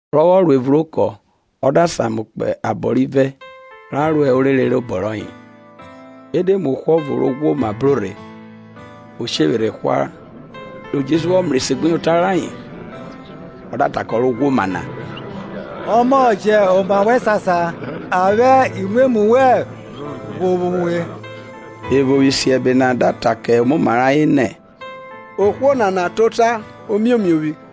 Rọ vwọ ro evun rẹ okọ, ọ da samu kpo abọ rivẹ, ra ro orere rẹ obọ rọye. E de mu ohwo ọvo ro ghwoma bro rhe, o shevwerhẹ ehwa; ri Jesu vwọ mrẹ esegbuyota rayen, ọ da ta kẹ ọ ro ghwoma na, ọmọ mẹ, jẹ oma wẹn sasa, a vwẹ imwemwu wẹn ghovwo uwe. Evo vwẹ isiẹbe na da ta kẹ omoma rẹ ayen nẹ, Ohwo nana ta ota rẹ ẹgua.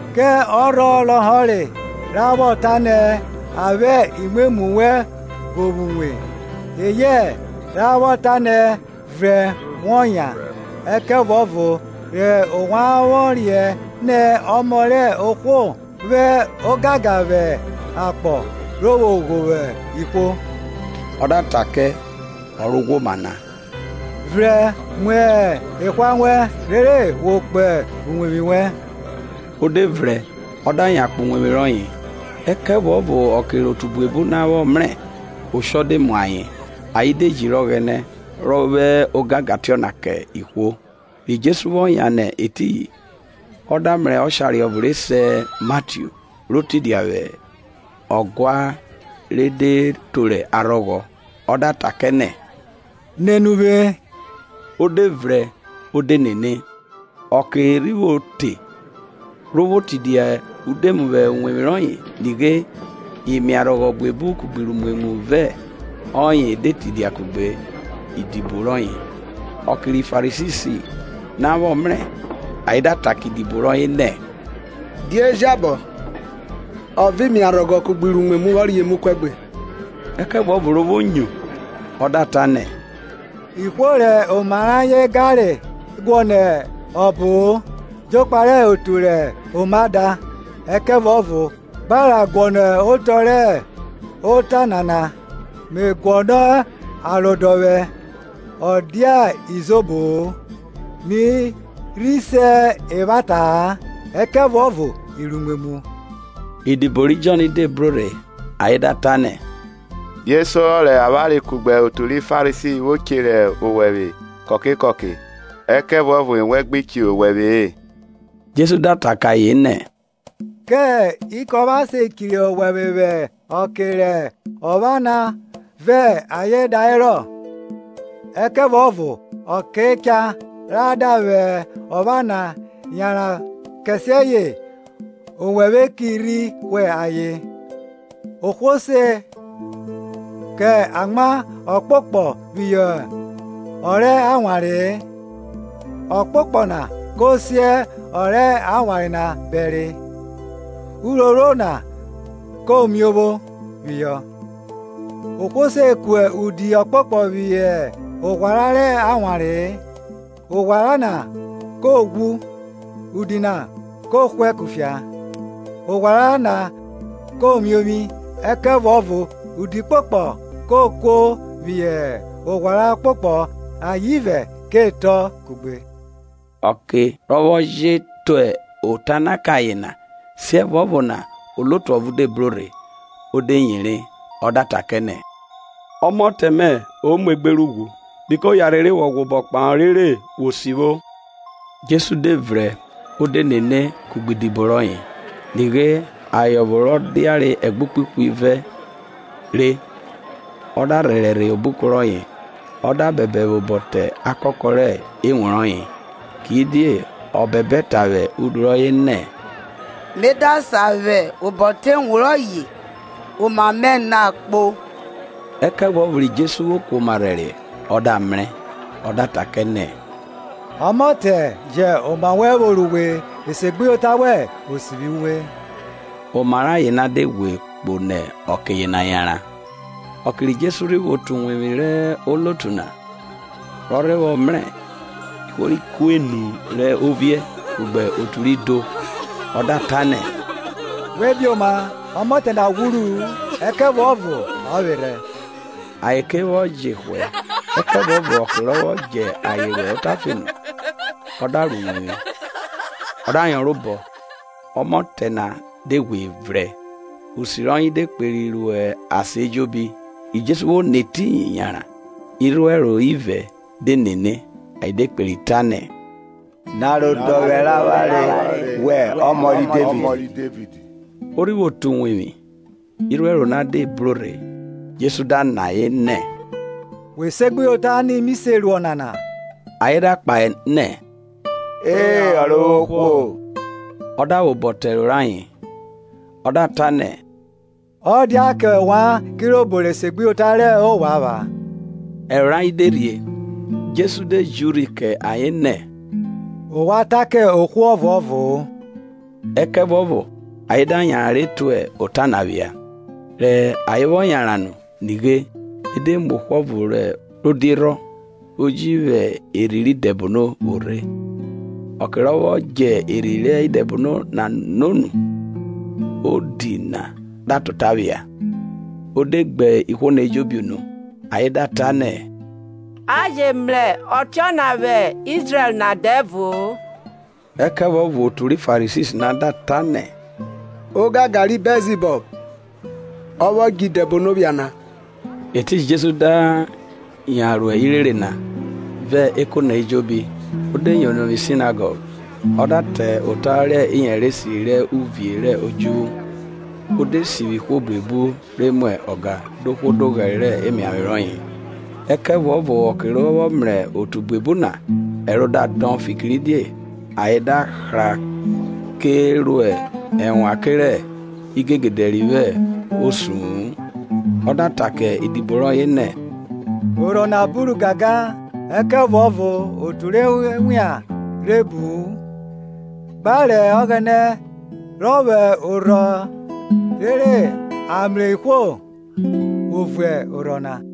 Kẹ ọrhọ lọhọre ra vwọ ta nẹ, A vwẹ imwemwu wẹn ghovwo uwe: eyẹ ra vwọ ta nẹ, Vrẹn wọ yan? Ẹkẹvuọvo re ovwan vwọ riẹn nẹ Ọmọ rẹ ohwo vwo ogangan vwẹ akpọ ro vwo ghovwo ihwo, ọ da ta kẹ ọ ro ghwoma na, Vrẹn mu ehwa wẹn, rere wọ kpo uwevwi wẹn. O de vrẹn ọ da yan kpo uwevwi rọye. Ẹkẹvuọvo ọke rẹ otu buebu na vwọ mrẹ, oshọ de mu ayen, ayen de jiri Ọghẹnẹ, rọ vwẹ ogangan tiọna kẹ ihwo. Ri Jesu vwọ yan nẹ etiyin, ọ da mrẹ ọshare ọvo re se Matiu, ro tidia vwẹ ọguan re de toro arhọghọ. Ọ da ta kẹ nẹ, Nene uvwe. O de vrẹn, o de nene. Ọke rhi vwo te, ro vwo tidia udemu vwẹ uwevwi rọye, nighe imiarhọghọ buebu kugbe iruimwemwu vẹ ọye de tidia kugbe idibo rọye. Ọke ri Farisi na vwọ mrẹ, ayen da ta kẹ idibo rọye nẹ, Die jabọ ọ vẹ imiarhọghọ kugbe iruimwemwu vwọ ria emu kuẹgbe? Ẹkẹvuọvo ro vwo nyo, ọ da ta nẹ, Ihwo rẹ oma rẹ ayen ganre guọnọ ọbo-o, jokpa rẹ otu rẹ oma da. Ẹkẹvuọvo gba ra guọnọ otọ rẹ ota nana, me guọnọ arodọvwẹ, ọ dia izobo-o; mi rhi se evwata-a, ẹkẹvuọvo iruimwemwu. Idibo ri Jọn de bro rhe ayen da ta nẹ, Die sorọ rẹ avwanre kugbe otu ri Farisi vwo chirẹ owẹvwe kọke kọke, ẹkẹvuọvo ewẹn gbi chirẹ owẹvwe-e. Jesu da ta kẹ ayen nẹ, Kẹ ikopha se chiri owẹvwe vwẹ ọke rẹ ọpha na vẹ ayen da herọ? Ẹkẹvuọvo ọke cha ra da vwẹ opha na yanran kẹsiẹye owẹvwe ki rhi hwe ayen. Ohwo se ko amwa ọkpokpọ phihọ ọ rẹ awanre-e, ọkpokpọ na ko si ọ rẹ awanre na bẹre, uphrophro na ko miovwi phihọ. Ohwo se ku udi ọkpokpọ phihọ oghwara rẹ awanre-e, oghwara na ko ghwu, udi na kọ hwẹ kufia, oghwara na ko miovwi. Ẹkẹvuọvo udi ọkpokpọ ke kuo phihọ oghwara ọkpokpọ ayen ivẹ ke tọn kugbe. Ọke rọ vwọ je ta ota na kẹ ayen na, Siẹvuọvo na onotu ọvo de bro rhe, o de yere ọ da ta kẹ nẹ, Ọmọtẹ mẹ o muegbe rẹ ughwu, biko yanrhe re wọ rhe ghwẹ obọ kpahọ rere wo sivwo. Jesu de vrẹn o de nene, kugbe idibo rọye. Nighe aye ọvo ro diare ẹgbukpe ihwivẹ re, ọ da rhẹrẹ rhe obuko rọye, ọ da bẹbẹ vwẹ obọ te akakọ rẹ ewun rọye. Kidie ọ bẹbẹ ta vwẹ udu rọye nẹ, me da sa vwẹ obo te ewun rọye, oma me na kpo. Ẹkẹvuọvo ri Jesu vwo kuoma rhẹriẹ ọ da mrẹ; ọ da ta kẹ nẹ, Ọmọte jẹn oma wẹn vworo uwe; esegbuyota wẹn o sivwi uwe. Oma rẹ aye na de ghwe kpo nẹ ọke yena yanran. Ọke ri Jesu rhi vwo te uwevwi rẹ onotu na, rọ rhe vwọ mrẹ ihwo ri kuenu rẹ oviẹ kugbe otu ri do, ọ da ta nẹ, We bioma; ọmọte na ghwuru-u, ẹkẹvuọvo ọ vwerhe; ayen ke vwọ jevwẹ. Ẹkẹvuọvo ọke rọ vwọ djẹ ayen ro otafe nu, ọ da ro uwevwi, ọ da yọnrọn obọ, ọmọte na de ghwe vrẹn. Usi rọye de kperi ro asan ejobi. Ri Jesu vwo nẹ etiyin yanran, irhuẹro ivẹ de nene, ayen de kperi ta nẹ, Ni arodọvwẹ rẹ avwanre, Wẹ ọmọ ri Devid. O rhi vwo te uwevwi, irhuẹro na de bro rhe; Jesu da nọ ayen nẹ, We segbuyota ni mi se ru ọnana? Ayen da kpahe nẹ, E Ọrovwohwo. Ọ da vwẹ obọ te ẹro rayen, ọ da ta nẹ, ọ dia kẹ ovwan kirobo rẹ esegbuyota rẹ ovwan epha. Ẹro rayen de rhie. Jesu de ji urhi kẹ ayen nẹ, ovwan ta kẹ ohwo ọvuọvo-o. Ẹkẹvuọvo ayen da yanran re tue ota na phia. Rẹ ayen vwọ yanran nu, nighe e de mu ohwo ọvo ro diunu, ro ji vwo erhi re idẹbono vwo rhe. Ọke rọ vwọ djẹ erhi rẹ idẹbono na no nu, odiunu na da ta ota phia. O de gbe ihwo na ejobi unu, ayen da ta nẹ, a je mrẹ ọtiọna vwẹ Izrẹl na dẹvo-o. Ẹkẹvuọvo otu ri Farisi na da ta nẹ, Ogangan ri osun rẹ idẹbono ọ vwo djẹ idẹbono phia na. Etiyin Jesu da yan ro irere na, vẹ eko na ejobi, o de yono vwi Sinagọg, ọ da ta ota rẹ iyẹnrẹ esiri rẹ uvie rẹ odjuvwu, o de sivwi ihwo buebu re mwa ọga dohwo doghẹre rẹ emiavwe rọye. Ẹkẹvuọvo ọke rọ vwọ mrẹ otu buebu na, ẹro da dọn, fikiridie ayen da hra ke ro ẹnwan kerẹ igegede ri vwo osu-un. Ọ da ta kẹ idibo rọye nẹ, orhọ na buru gangan, ẹkẹvuọvo otu rẹ owian rhe bu-u. Gba rẹ Ọghẹnẹ ro vwo orhọ rere a mrẹ ihwo vwo vun orhọ na.